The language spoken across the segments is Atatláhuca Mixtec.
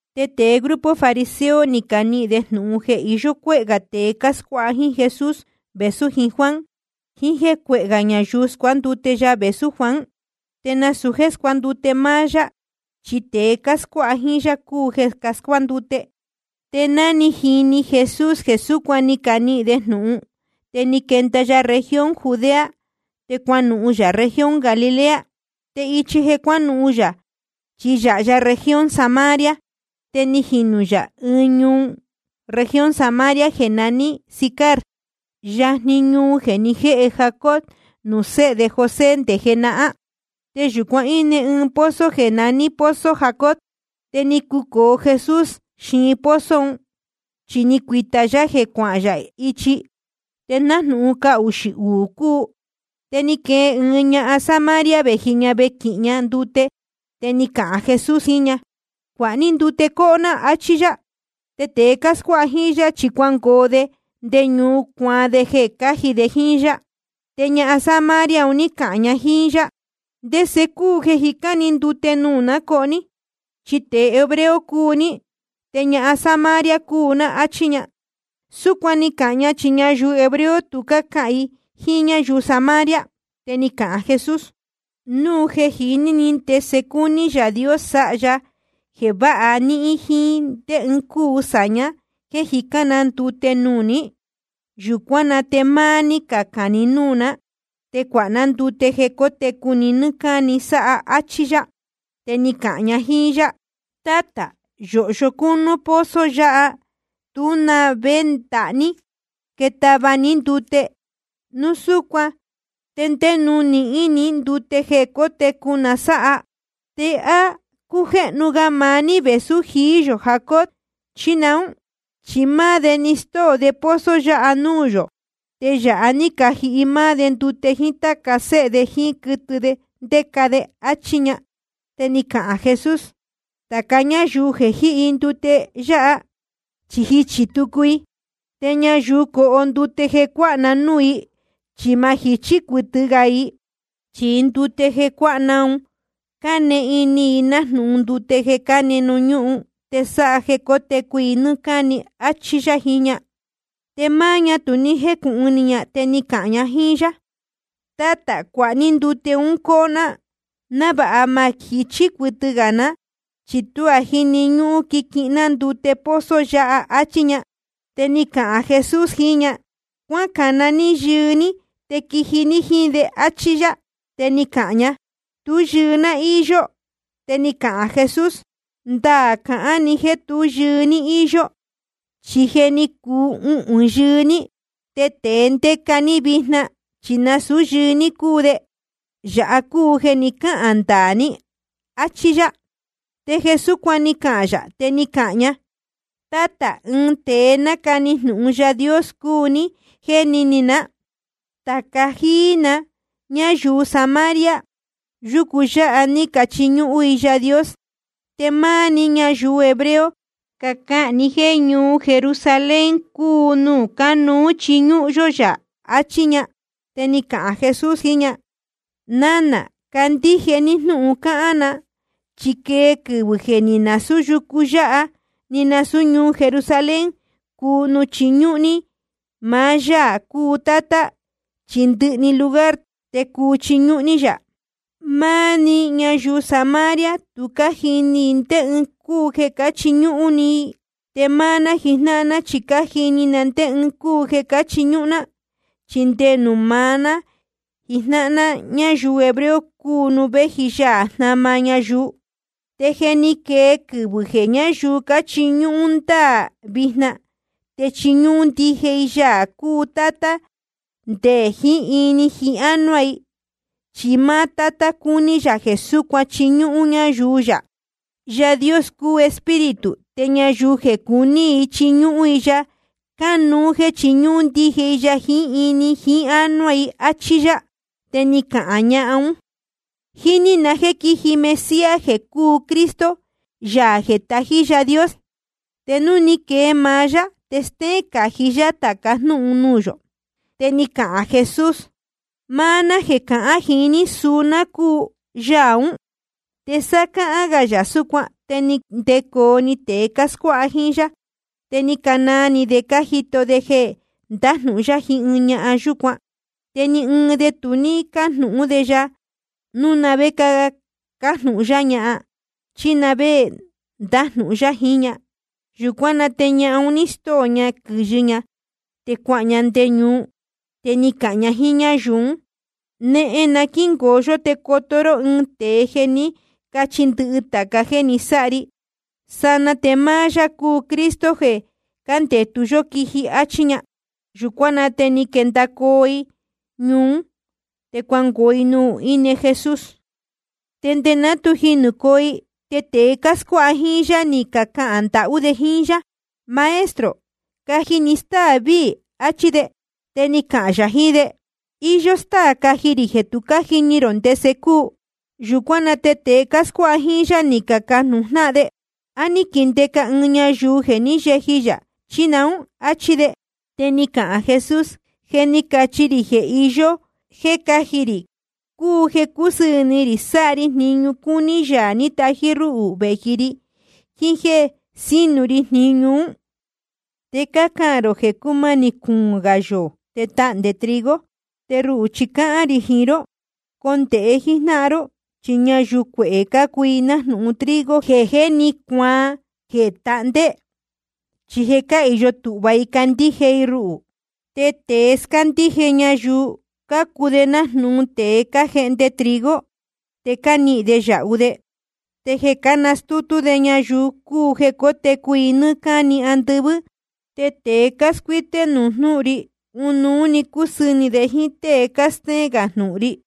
Te tēe grupo fariseo, ni canihīn de jnūhun jeē iyó cuéhē gā tēe cáscuáha jíín Jesús vēsú jiín Juan, jiín jéē cuehē gā ñayuu scuándute ya vēsú Juan. Te nasūu jéē scuándute máá yá, chi tēe cáscuáha jíín yá cúu jeē cascuándute. Te ná ni jini Jesús jeē súcuan ni canihīn de jnūhun, te ni quenda ya región Judea, te cuanuhun yā región Galilea. Te ichi jeē nuhún yā chi yáha región Samaria. Te ni jinū yā ɨɨn ñuu región Samaria jeē naní Sicar, yajni ñuhun jeē ni jéhe Jacob nuū séhe de José nde jenahán. Te yūcuan íne pozo jeē naní pozo Jacob. Te ni cucōo Jesús xiin pozo un, chi ni cuīta yá jeē cuahán yā ichi. Te nájnūhun cahuxī uū cúu. Te ni quee ɨɨn ñahan Samaria, vēji ña vequihin ña ndute. Te ni cahān Jesús jiín ña: Cuāha ní ndute coho ná, áchí yá. Te tēe cáscuáha jíín yá, chi je cuangoo de nde ñuu, cuacuaan de jeē cáji de jíín yá. Te ñahan Samaria un ní cahān ña jíín yá: ¿Ndese cúu jeē jicán ni ndute nuū ná coho ní? Chi tēe hebreo cúu ní, te ñahan Samaria cúu ná, áchí ña. Súcuan ni cahān ña, chi ñayuu hebreo tu cácahān i jíín ñáyuu Samaria. Te ni cahān Jesús: Núu jeē jiní ni ndese cúní Yaā Dios sáha ya jeē váha níhín, jíín ndé ɨɨn cúu sāña jéē jicán na ndute nuū ní, yūcuán na te máá ní cacān ni núū ná, te cuāha ná ndute jeē cótecu ni nɨ́ɨ́ cáni sáha, áchí yá. Te ni cahān ña jíín yá: Tátā, yōhyo cúnú pozo yáha, te tú na vé ndahá ní jéē táva ní ndute. Núu súcuan ¿te ndé nuū nihín ni ndute jeē cótecu na sáha? ¿Te á cújéhnu ga maá ní vēsú jií yō Jacob, chí naún? Chi máá de ni stóo de pozo yáha nuū yō. Te yāha ní cajihi máá de ndute, jíín táca séhe de, jíín quɨtɨ ndéca de. Achí ña. Te ni cahān Jesús: Tāca ñáyuu jeē jíhi ndute yáha, chi jichī tucu i. Te ñayuu coho ndute jeē cuáha na núū i, chi ma jichí cuɨtɨ gā i. Chi ndute jeē cuáha ná un, cane ini i nájnūhun ndute jeē cáne ñuhún, te sáha jeē cotecu i nɨ́ɨ́ cáni, áchí yá jiín ña. Te máá ña tu ní jécūhun ni ña, te ni cahān ña jíín yá: Tátā, cuāha ní ndute ún coho ná, návāha ma jichí cuɨtɨ gā ná, ni tuá jíni ñúhun quiquihin ná ndute pozo yáha, áchí ña. Te ni cahān Jesús jiín ña: Cuácana ní yɨɨ ní te quiji ní jíín de, áchí yá. Te ni cahān ña: Tú yɨɨ ná íyó. Te ni cahān Jesús: Ndaā cahán ni jéē tú yɨɨ ní íyó. Chi je ni cuu uhūn yɨɨ ní, te tēe ndéca ní vijna chi nasūú yɨɨ ní cúu de. Yāha cúu jeē ni cáhān ndaā ní, áchí yá. Te jeē súcuan ni cahān yā, te ni cahān ña: Tátā, ɨɨn tēe nácani jnūhun Yaā Dios cúu ní, jéni ni ná. Tāca jíí na ñáyuu Samaria, yucu yáha ní cachiñúhún i Yaā Dios. Te máá ní ñayuu hebreo, cácahān ni jéē ñuu Jerusalén cúu nuū cánuú chiñúhún yó yā, achí ña. Te ni cahān Jesús jiín ña: Nánā, candíje ní jnúhun cáhán na, chi quee quɨvɨ̄ jeē ni nasūú yucu yáha ni nasūú ñuu Jerusalén cúu nuū chiñúhún ní maá Yaā cúu Tátá, chi ndɨhɨ‑ni lugar te cuu chiñúhún ní yá. Máá ní ñáyuu Samaria tu cájini ni ndé ɨɨn cúu jeē cáchiñúhún ní. Te máá ná jijnáhan ná chi cájini na ndé ɨɨn cúu jeē cáchiñúhún ná. Chi nde nuū maá ná jijnáhan ná ñáyuu hebreo cúu nuū véji Yaā jnama ñayuu. Te je ni quee quɨvɨ̄ jeē ñáyuu cáchiñúhún ndáā, vijna te chiñúhún ndije i Yaā cúu Tátá nde jiín ini jiín ánuá i. Chi máá Tátá cúní yā jeē súcuan chiñúhún ñáyuu yā. Yaā Dios cúu Espíritu, te ñayuu jeē cuní i chiñúhún i ya, cánuú jéē chiñúhún ndije i ya jiín ini jiín ánuá i, áchí yá. Te ni cahān ñahan ún: Jíní na jéē quíji Mesías jeē cúu Cristo, Yaā jeē tají Yaā Dios. Te núu ni quee maá yá, te stéén cají yá tāca jnúhun nuū yō. Te ni cahān Jesús: Máá ná jeē cahán jiín ní, suu ná cúu Yaā ún. Te sá cáhán gā yā súcuan, te ni ndecoo‑ni tēe cáscuáha jíín yá. Te ni canaa ni de cájito de jeē ndájnūhun yá jiín ñahan yúcuan. Te ni ɨɨn de tu ní cájnūhún de ya núu na vé cájnūhun yá ña chí na vé ndájnūhun yá jiín ña. Yūcuán na te ñahan un ní stóo ña quɨ̄yɨ ña, te cuahān ña nde ñuu. Te ni cahān ña jíín ñáyuu ún: Nehen na quíngoo yó te coto ró ɨɨn tēe jeē ní cachi ndɨhɨ tāca jéē ni sáha ri. Sanaa te máá yá cúu Cristo, jeē cándetu yó quiji, áchí ña. Yūcuán na te ni quendacoo i ñuu ún, te cuangoo i nuū íne Jesús. Te nde ná tu jinūcoo i, te tēe cáscuáha jíín yá ni cacahān ndahú de jíín yá: Maestro, caji ni stáā víī, achí de. Te ni cahān yā jiín de: Iyó stáā caji rī jeē tu cájini rō ndese cúu. Yūcuán na te tēe cáscuáha jíín yá, ni cacajnūhun jnáhan de: ¿A ní quindeca ɨɨn ñayuu jeē ní yeji yā, chí naún? áchí de. Te ni cahān Jesús: Jeē ní cachi rī jeē iyó jéē cáji rī cúu jeē cúsɨɨ̄ ni rī sáha ri jniñu cúní Yaā ní tají rúhū vēji ri, jiín jéē sínu ri jniñu ún. Te cácahān rō jeē cúmanī cuūn gā yoō te tahndē trigo. Te ruhū chi cáhán rī jiín ró: Condēhe jíjnáhan ró, chi ñayuu cuehē cácuu i nájnūhun trigo jeē jé ni cuaan jeē tahndé, chi je cáhīyo tūhva i candíje i ruhū. Te tēe scándíje ñayuu cácuu de nájnūhun tēe cájehnde trigo, te nihīn de yāhu de. Te jeē cánastútú de ñayuu cúu jeē cótecu i nɨ́ɨ́ cáni andɨvɨ́. Te tēe cáscuíté núu jnūhun ri, ɨnuú‑ni cusɨɨ̄ ni de jíín tée cástéén gā jnūhun ri.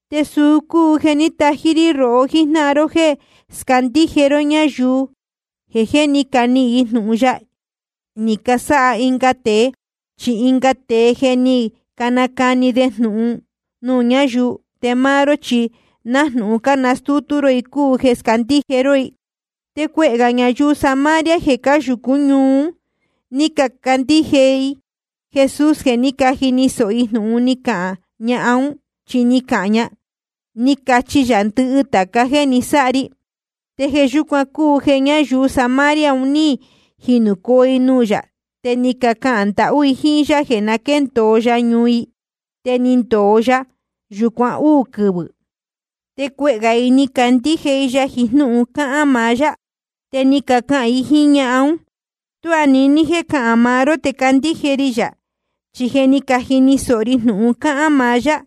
Te suu cúu jeē ní tají rí rohó jíjnáhan ró jéē scándíje ró ñayuu jeē jé ni canihīn jnūhun ya ni casáha ɨnga tēe. Chi ɨnga tēe je ni canacani de jnūhun nuū ñáyuu, te máá ró chi nájnūhun cánastútú ró i cúu jeē scándíje ró i. Te cuehē ñayuu Samaria jeē cáyūcú ñuu ún, ni cacandíje i Jesús jeē ní jini sōho i jnūhun ni cahān ñahan ún. Chi ni cahān ña: Ni cachi ya ndɨhɨ tāca jéē ni sáha ri. Te jeē yúcuan cúu jeē ñayuu Samaria un ní jinūcoo i nuū yā, te ni cacahān ndahú i jíín yá jeē na quéndōo ya ñuu i. Te ni ndōo ya yūcuan úū quɨvɨ̄. Te cuehē gā i ni cacandíje i ya jiín jnúhun cáhán maá yá. Te ni cacahān i jíín ñahan ún: Tuá niní jéē cahán maá ró te candíje ri yā, chi je ni cajini sōho ri jnūhun cáhán maá yá.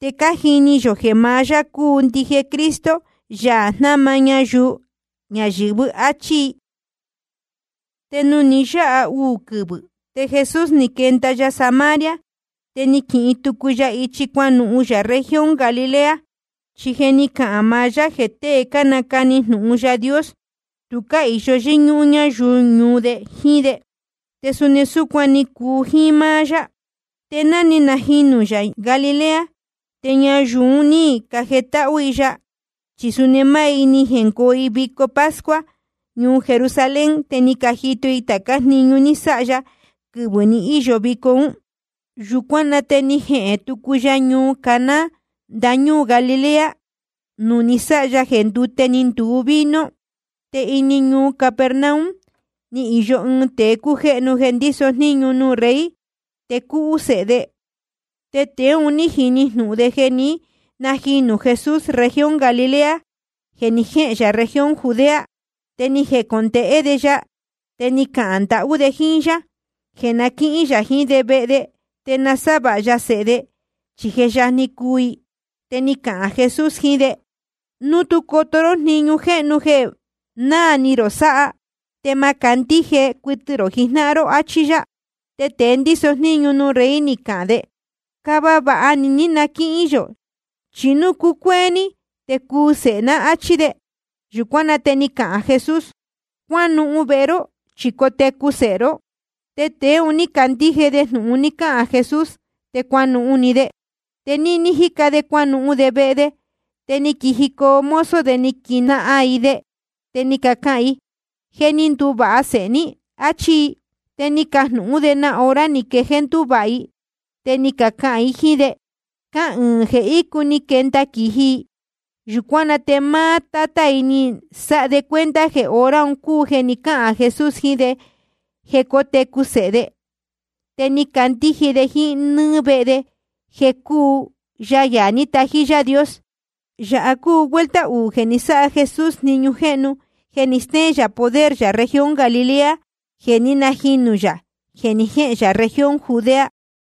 Te cájini yō jeē maá yá cúu ndije Cristo, Yaā jnama ñayuu ñayɨ̄vɨ́. Achí i. Te nuū ni yáha uū quɨvɨ̄ ún, te Jesús ni quenda ya Samaria, te ni quihin tucu ya ichi cuanuhun yā región Galilea. Chi je ni cahān maá yá jeē tée cánacani jnūhun Yaā Dios, tu cáhīyo yɨ́ñúhún ñáyuu ñuu de jíín de, te suni súcuan ni cuu jíín máá yá. Te ná ni najinū yā Galilea, te ñayuu un ní cajetáhú i ya, chi suni máá i ni jengoo i vico pascua ñuu Jerusalén, te ni cajito i tācá jniñu ní sáha ya quɨvɨ̄ ni íyo vico ún. Yūcuán na te ni jehēn tucu ya ñuu Caná ndañúū Galilea, nuū ni sáha ya jeē ndúte ni nduu vino. Te ini ñuu Capernaum ni īyo ɨɨn tēe cújéhnu jeē ndíso jníñu nuū rey. Te cúhú sēhe de. Tēe un ní jini jnūhun de jeē ní najinū Jesús región Galilea jeē ni jéhēn yā región Judea. Te ni jecondēhé de ya, te ni cahān ndahú de jíín yá jeē na quíhín yā jiín de vehe de, te nasávāha ya sēhe de, chi je yajni cuu i. Te ni cahān Jesús jiín de: Núu tú coto ró jniñu jéhnu jeē náā ni rō sáha, te ma candíje cuɨtɨ rō jijnáhan ró, áchí yá. Te tēe ndíso jníñu nuū rey, ni cahān de: Cava vāha ni ní na quíhín yō, chi núu cucuéé ní te cuu sēhe ná, áchí de. Yūcuán na te ni cahān Jesús: Cuánuhun vehe ró, chi cotecu sēhe ró. Te tēe un ní candíje de jnūhun ni cahān Jesús, te cuanuhun‑ni de. Te níní jíca de cuanuhun de vehe de, te ni quijicoo mozo de ni caquijnahan i de, te ni cacahān i: Je ni nduvāha sēhe ní, áchí i. Te ni cajnūhún de na hora ni quejéé ndúvāha i. Te ni cacahān i jíín de: Cahɨɨn jeē ícu ni quenda quīji i. Yūcuán na te máá tátá i ni sáha de cuenta jeē hora un cúu jeē ni cáhān Jesús jiín de jeē cótecu sēhe de. Te ni candíje de jíín nɨ́ɨ́ vehe de jeē cúu ya Yaā ní tají Yaā Dios. Yāha cúu vuelta uū jeē ni sáha Jesús jniñu jéhnu jeē ni stéén yā poder yā región Galilea, jeē ní najinū yā jeē ni jéhēn yā región Judea.